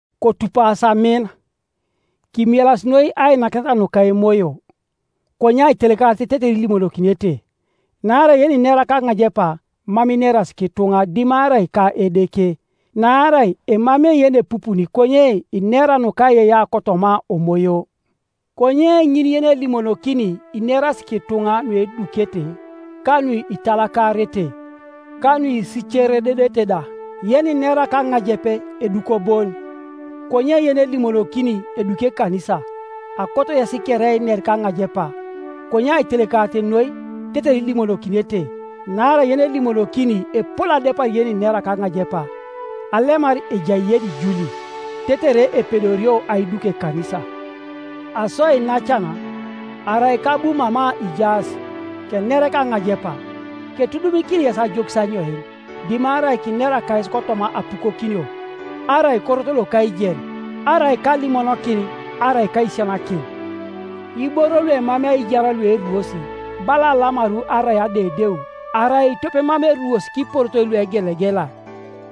Kotupasi amin, kimielasi noi ainakineta nuka emoyo, konye aitelekarit tetere ilimonokinete, Naarai yeninera kaŋajepa mam ineras kituŋa dimarai ka Edeke, naarai emamei yenepupuni konye inera nukaiyeiyea kotoma Omoyo. Konye ŋin yenelimonokini ineras kituŋa nuedukete ka nuitalakarete, ka nuisicerededete da. Yeninera kaŋajep eduko bon, konye yenelimonokini eduki ekanisa. Akoto yes kere einer kaŋajepa, konye aitelekarit noi tetere ilimonokinete. Naarai yenelimonokini epol adepar yeninera kaŋajepa, alemar ejai yenijuli, tetere epedorio aiduk ekanisa. Aso iinacan, arai kabu mama ijaas, kener kaŋajepa, ketudumikini yes ajokis anyoin, dimarai kinera kayes kotoma apukokinio, arai korot loka aijen, arai kalimonokin, arai kaisisianakin? Iboro luemamei aijar lueruos, bala alamaru arai adeudeu, arai tope mam eruosi kiporotoi luegelegela,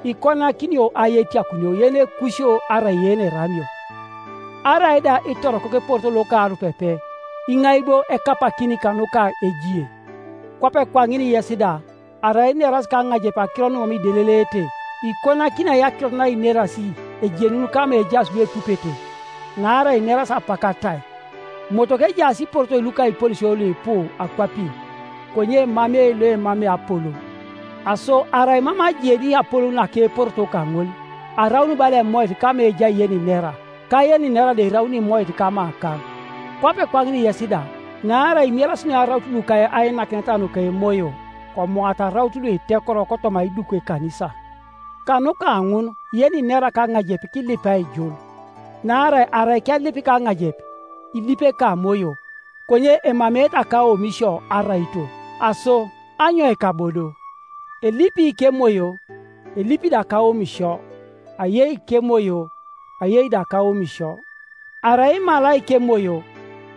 ikonakinio ai etiakunio yenekusio arai yeneramio? Arai da itorokok eporoto loka arupepe, iŋai bo ekapakin kanuka ejie? Kwape kwaŋin yes da; arai ineras kaŋajep akiro numam ideleleete, ikonakini ai akirot nainerasi ejenun kama ejaas luepupete? Naarai inerasi apak atai, Motoko ejaas iporotoi luka iponesio luipu akwapin, konye emamei loemamei apolou, Aso arai mam ajeni apolou naka eporoto kaŋol, araun bala emoit kama ejai yeninera, ka yeninera da eraun imoit kamakaŋ, Kwape kwaŋin yes da; naarai imielasi noi araut luka ainakineta nuka emoyo, komoata araut luitekoro kotoma aiduk ekanisa. Kanuka ŋun yeninera kaŋajep kilip aijul. Naarai arai kelip kaŋajep, ilipi ekamoyo, konye emameete akaomisio araito. Aso anyoika bo do? Elipi kemoyo, elipi da kaomisio; ayei kemoyo, ayei da kaomisio. Arai imalai kemoyo,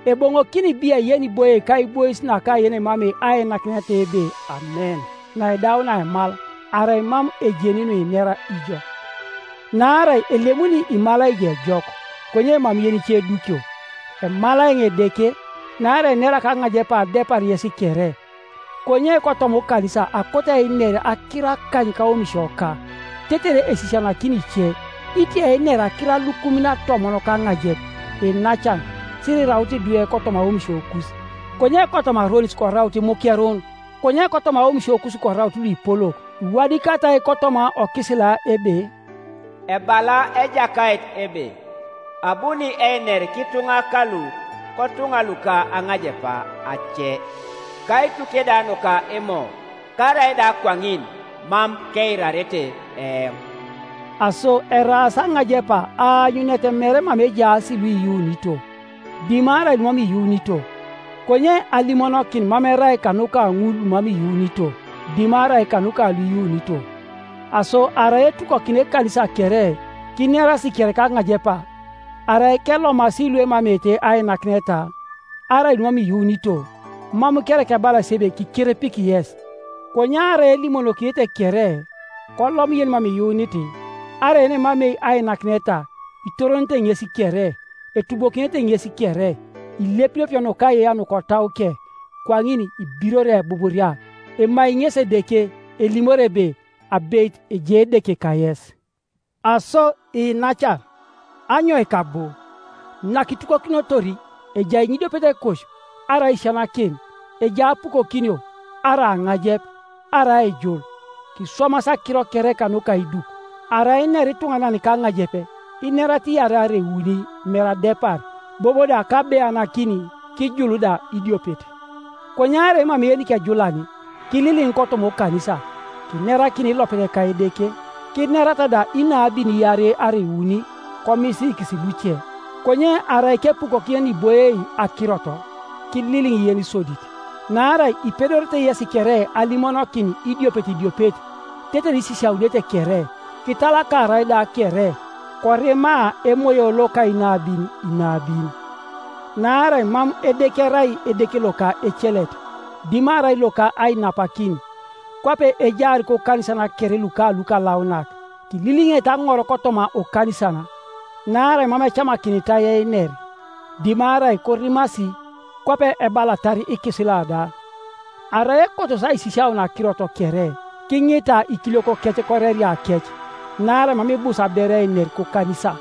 eboŋokini biai yeniboie kaibois naka yenemamei ainakineta ebe, “Amen,” naidaunia aimal, arai mam ejeni nuinera ijo? Naarai elemuni imalai ijo ejok, konye mam yenice edukio. Emalai eoŋ Edeke, naarai enera kaŋajepa adepar yes kere; konye kotoma okanisa akoto einer akiro akany kaomisioka, tetere esisianakini ice, itia einer akiro alukumin atomon kaŋajep. Iinacan, sirikiraut idwe kotoma aomisiokus; konye kotoma aronis koraut imukerun, konye kotoma aomisiokus koraut luipolok. Iwadikatai kotoma okisila ebe, “Ebala Ejakait ebe, Abuni einer kituŋa kalu kotuŋa luka aŋajepa ace, kaituke da nuka imo, karaida kwaŋin, mam keirarete eoŋ.” Aso eraas aŋajepa aanyunet mere mama ejaas luiyuunito, dimarai lumam iyuunito, konye alimonokin mam erai kanuka ŋul lumam iyuunito dimarai kanuka luiyuunito. Aso arai etukokina ekanisa kere, kinerasi kere kaŋajepa, arai kelomasi luemameete ainakineta, arai lumam iyuunito, mam kereka ebalasi ebe kikerepiki yes? Konye arai elimonokinete kere, kolom yenimam iyuunit, arai yenemamei ainakineta, itoronete ŋes kere, etubokinete ŋes kere, ilepilepio nukaiyeiyea nukotauke; kwaŋin ibirori ebuburia, emai ŋesi Edeke, elimori ebe, “Abeit ejai Edeke kayes.” Aso iinacan, anyoika bo? Nakitukokinotor, ejai ŋinidiopet ekosio, arai aisisianakin, ejai apukokinio, arai aŋajep, arai aijul. Kiswamas akiro kere kanuka aiduk. Arai inera ituŋanan kaŋajep, kinerata iarei arai iuni, mere adepar, bobo da kabeanakin; kijul da idiopet. Konye arai emamei yenikejulan, kililiŋ kotoma okanisa, kinerakin ilopet ka Edeke. Kinerata da inabin iarei arai iuni, komisiikis luce. Konye arai kepukokin yeniboie akirot, kililiŋ yenisodit. Naarai ipedorete yesi kere alimonokin idiopet idiopet, tetere isisiaunete kere, kitalakarai da kere; korima emoyo loka inabin inabin. Naarai mam Edeke erai Edeke loka ecelet, dimarai loka ainapakin. Kwape ejaar kokanisan kere luka lukalaunak, kililiŋete aŋor kotoma okanisan. Naarai mam ecamakinitai einer, dimarai korimasi, kwape ebalatar ikisila da. Arai ekotos aisisiaun akirot kere, kiŋita ikiliokokec koreriakec, Naarai mam ibus aberu einer kokanisa.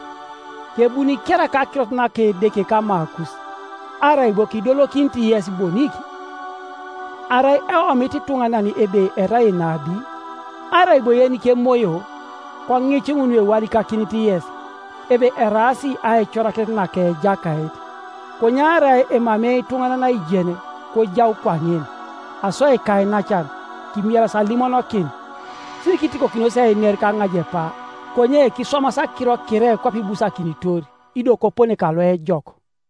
Kebuni kereka akirot naka Edeke kamakus, arai bo kidolokinit yes bonik? Arai eomit ituŋanan ebe erai enabi, arai bo yenikemoyo, koŋic ŋun nuewadikakinit yes, ebe, eraas aicorakinet naka Ejakait. Konye arai emamei ituŋanan aijen, kojau kwaŋin. Aso ikainacan, kimielas alimonokin, sirikitikokinos einer kaŋajepa; konye kiswamas akiro kere kwape ibusakinitor, ido kopone kaloejok.